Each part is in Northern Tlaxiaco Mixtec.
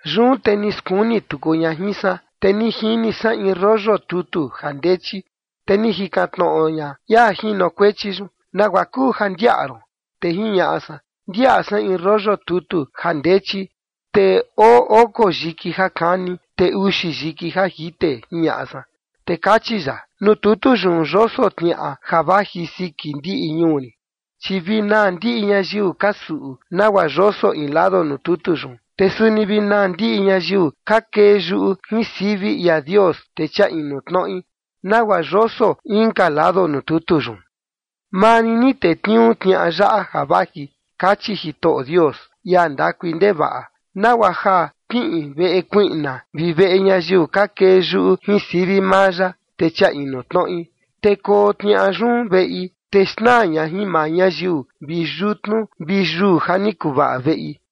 Yun te ni skuni tuku ña jin san, te ni jini san in rollo tutu ja ndechi. Te ni jikan tnoꞌo ña ia jinokuechi yun: “¿Nagua kuu ja ndiaꞌa ron?” Te jiñaꞌa san: “Ndiaꞌa san in rollo tutu ja ndechi, te oo oko yiki ja kani, te uxi yiki ja jite”, jiñaꞌa san. Te kachi ya: “Nuu tutu yun yoso tniaꞌa ja vaji siki ndiꞌi ñuu rin, chi vi naa ndiꞌi ñayiu ka suꞌu nagua yoso in lado nuu tutu yun. Te suni vi naa ndiꞌi ñayiu ka kee yuꞌu jin sivi ia Dios, te chia inu tnoꞌi, nagua yoso inka lado nuu tutu yun. Maa rin ni tetniuu tniaꞌa yaꞌa ja vaji kachi Jitoꞌo Dios, ia ndakui ndevaꞌa, nagua ja kiꞌin veꞌe kuiꞌna vi veꞌe ñayiu ka kee yuꞌu jin sivi maa ya, te chia tnoꞌi. Te koo tniaꞌa yun veꞌi, te xnaa ña jin maa ñayiu vi yutnu vi yuu ja ni kuvaꞌa veꞌi.”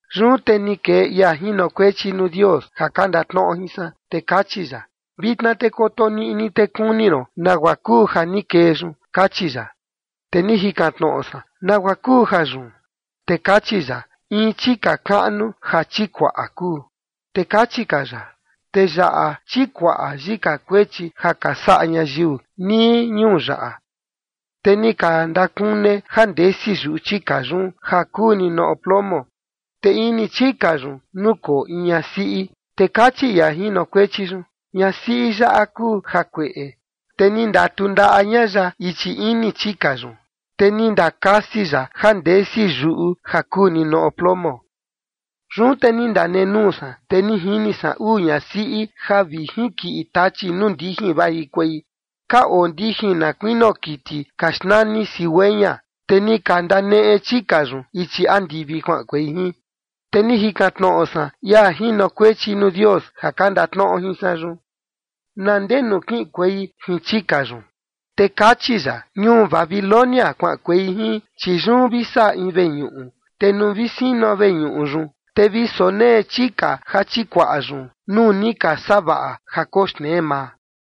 Yun te ni kee ia jinokuechi nuu Dios ja ka ndatnoꞌo jin san, te kachi ya: “Vitna te koto niꞌni, te kuni ron nagua kuu ja ni kee yun” kachi ya. Te ni jikan tnoꞌo san: “¿Nagua kuu jayun?” Te kachi ya: “In chika kaꞌnu ja chikuaꞌa kuu”. Te kachi ka ya: “Te yaꞌa chikuaꞌa yika kuechi ja ka saꞌa ñayiu nii ñuu yaꞌa”. Te ni ka ndakune ja ndesi yuꞌu chika yun ja kuu ninoꞌo plomo, te ini chika yun nukoo in ñasiꞌi. Te kachi ia jinokuechi yun: “Ñasiꞌi yaꞌa kuu jakueꞌe”, te ni ndatundaꞌa ña ya ichi ini chika yun, te ni ndakasi ya ja ndesi yuꞌu ja kuu ninoꞌo plomo. Yun te ni ndanenuu san, te ni jini san uu ñasiꞌi ja vi jinkiꞌi tachi nuu ndijin vajikuei. Ka oo ndijin na kuinio kiti ka xnani cigüeña, te ni ka ndaneꞌe chika yun ichi andivi kuaꞌankuei jin. Te ni jikan tnoꞌo san ia jinokuechi nuu Dios ja ka ndatnoꞌo jin san yun: “¿Na ndee nuu kiꞌinkuei jin chika yun?” Te kachi ya: “Ñuu Babilonia kuaꞌankuei jin, chi yun vi saꞌa in veñuꞌu, te nuu vi sino veñuꞌu yun, te vi sonee chika ja chikuaꞌa yun nuu ni ka savaꞌa ja koxnee maa”.